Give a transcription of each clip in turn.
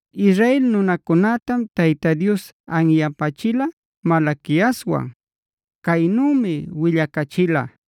Israel nunacunätam Tayta Dios anyapächila Malaquiaswan. Caynümi willacachila.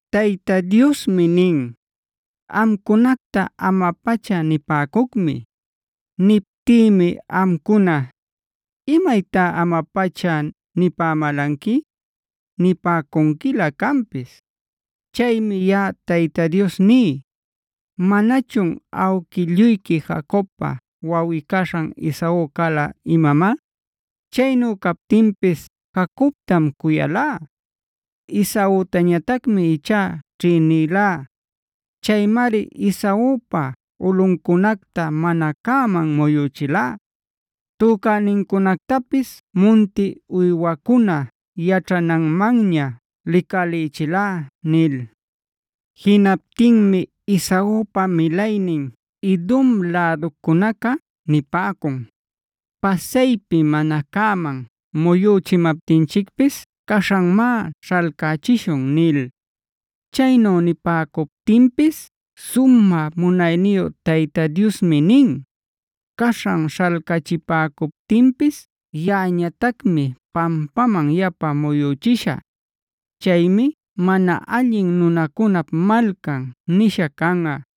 Tayta Diosmi nin: “Amcunacta ama-pacha nipäcucmi. “Niptïmi amcuna: ‘¿Imaytá ama-pacha nipämalanqui?’ nipäcunquilä canpis. “Chaymi yaꞌa Tayta Dios ní: ¿Manachun awquilluyqui Jacobpa wawꞌi-caśhan Esau cala imamá? Chaynu captinpis Jacobtam cuyalá. Esautañatacmia ichá ćhïnilá. Chaymari Esaupa ulꞌuncunacta mana cäman muyüchilá; tücänincunactapis munti uywacuna yaćhananmanña licalïchilá” nil. Jinaptinmi Esaupa milaynin Edomb läducunaca nipäcun: “Pasaypi mana cäman muyüchimaptinchicpis caśhanmá śhalcachishun” nil. Chaynu nipäcuptinpis sumä munayniyu Tayta Diosmi nin: “Caśhan śhalcachipäcuptinpis yaꞌañatacmi pampaman yapa muyüchishä. Chaymi ‘Mana allin nunacunap malcan’ nisha canꞌa;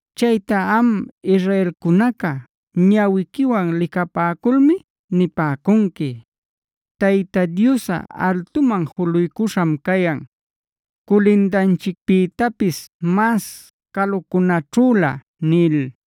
Chayta am israelcunaca ñawiquiwan licapäculmi nipäcunqui: ‘Tayta Diosꞌa altuman juluycuśham cayan, culindanchicpïtapis mas calucunaćhülä’” nil.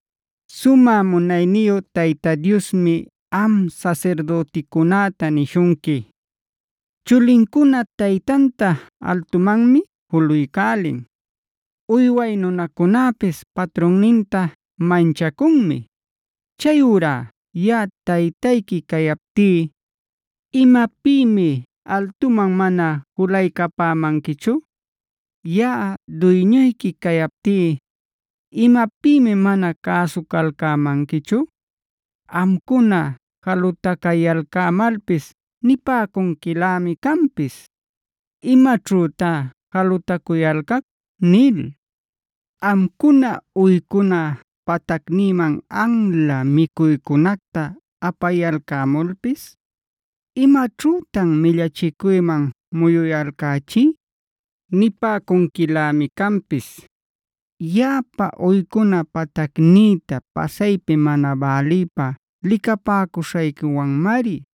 Sumä munayniyu Tayta Diosmi am sasirdüticunäta nishunqui: “Chulincuna taytanta altumanmi juluycälin. Uyway nunacunäpis patrunninta manchacunmi. Chayurá yaꞌa Taytayqui cayaptí, ¿imapïmi altuman mana julaycapämanquichu? Yaꞌa duyñuyqui cayaptí, ¿imapïmi mana cäsucalcämanquichu? Amcuna jalutacayalcämalpis nipäcunquilämi canpis: ‘¿Imaćhütá jalutacuyalcac?’ nil. Amcuna uycuna patacnïman anla micuycunacta apayalcämulpis:d ‘¿Imaćhütan millachicuyman muyuyalcächí?’ nipäcunquilämi canpis. Yaꞌapa uycuna patacnïta pasaypi mana bälïpä licapäcuśhayquiwanmari.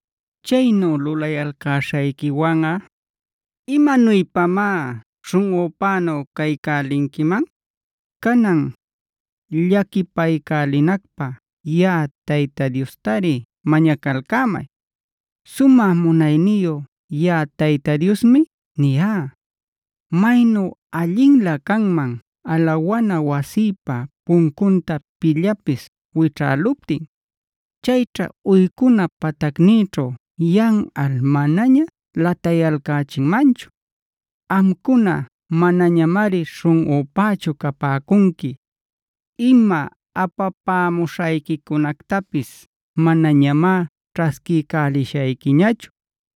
“Chaynu lulayalcäśhayquiwanꞌa, ¿imanuypamá śhunꞌunpänu caycälinquiman? Canan, llaquipaycälinacpä yaꞌa Tayta Diostari mañacalcämay. Sumä munayniyu yaꞌa Tayta Diosmi niyá. ¡Maynu allinlä canman alawana wasïpa puncunta pillapis wićhäluptin! Chayćha uycuna patacnïćhu yanꞌal manaña latayalcächinmanchu. Amcuna manañamari śhunꞌüpächu capäcunqui; ima apapämuśhayquicunactapis manañamá ćhasquiycälishayquiñachu.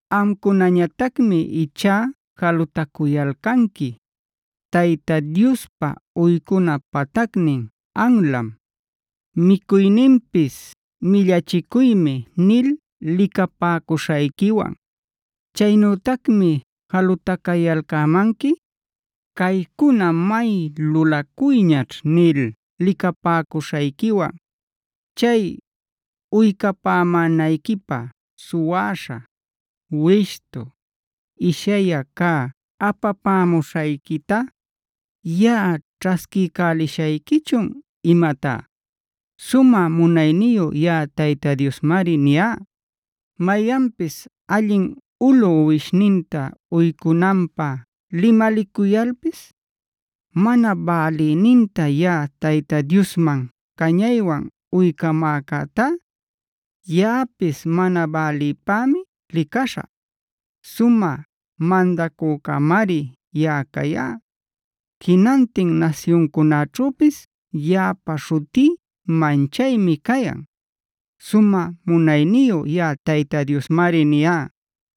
“Amcunañatacmi ichá jalutacuyalcanqui: ‘Tayta Diospa uycuna patacnin anlam; micuyninpis millachicuymi’ nil licapäcuśhayquiwan. Chaynütacmi jalutacayalcämanqui: ‘Caycuna may lulacuyñaćh’ nil licapäcuśhayquiwan. Chay ¿uycapämänayquipä suwäśha, wishtu, ishyayä cä apapämuśhayquita, yaꞌa ćhasquiycälishayquichun imatá? Sumä munayniyu yaꞌa Tayta Diosmari niyá. “Mayanpis allin ulu uwishninta uycunanpä limalicuyalpis, mana bälïninta yaꞌa Tayta Diosman cañaywan uycamäcätá, yaꞌapis mana bälïpämi licaśhä. Sumä mandacücämari yaꞌa cayá. Jinantin nasyuncunäćhüpis yaꞌapa śhutí manchaymi cayan. Sumä munayniyu yaꞌa Tayta Diosmari niyá.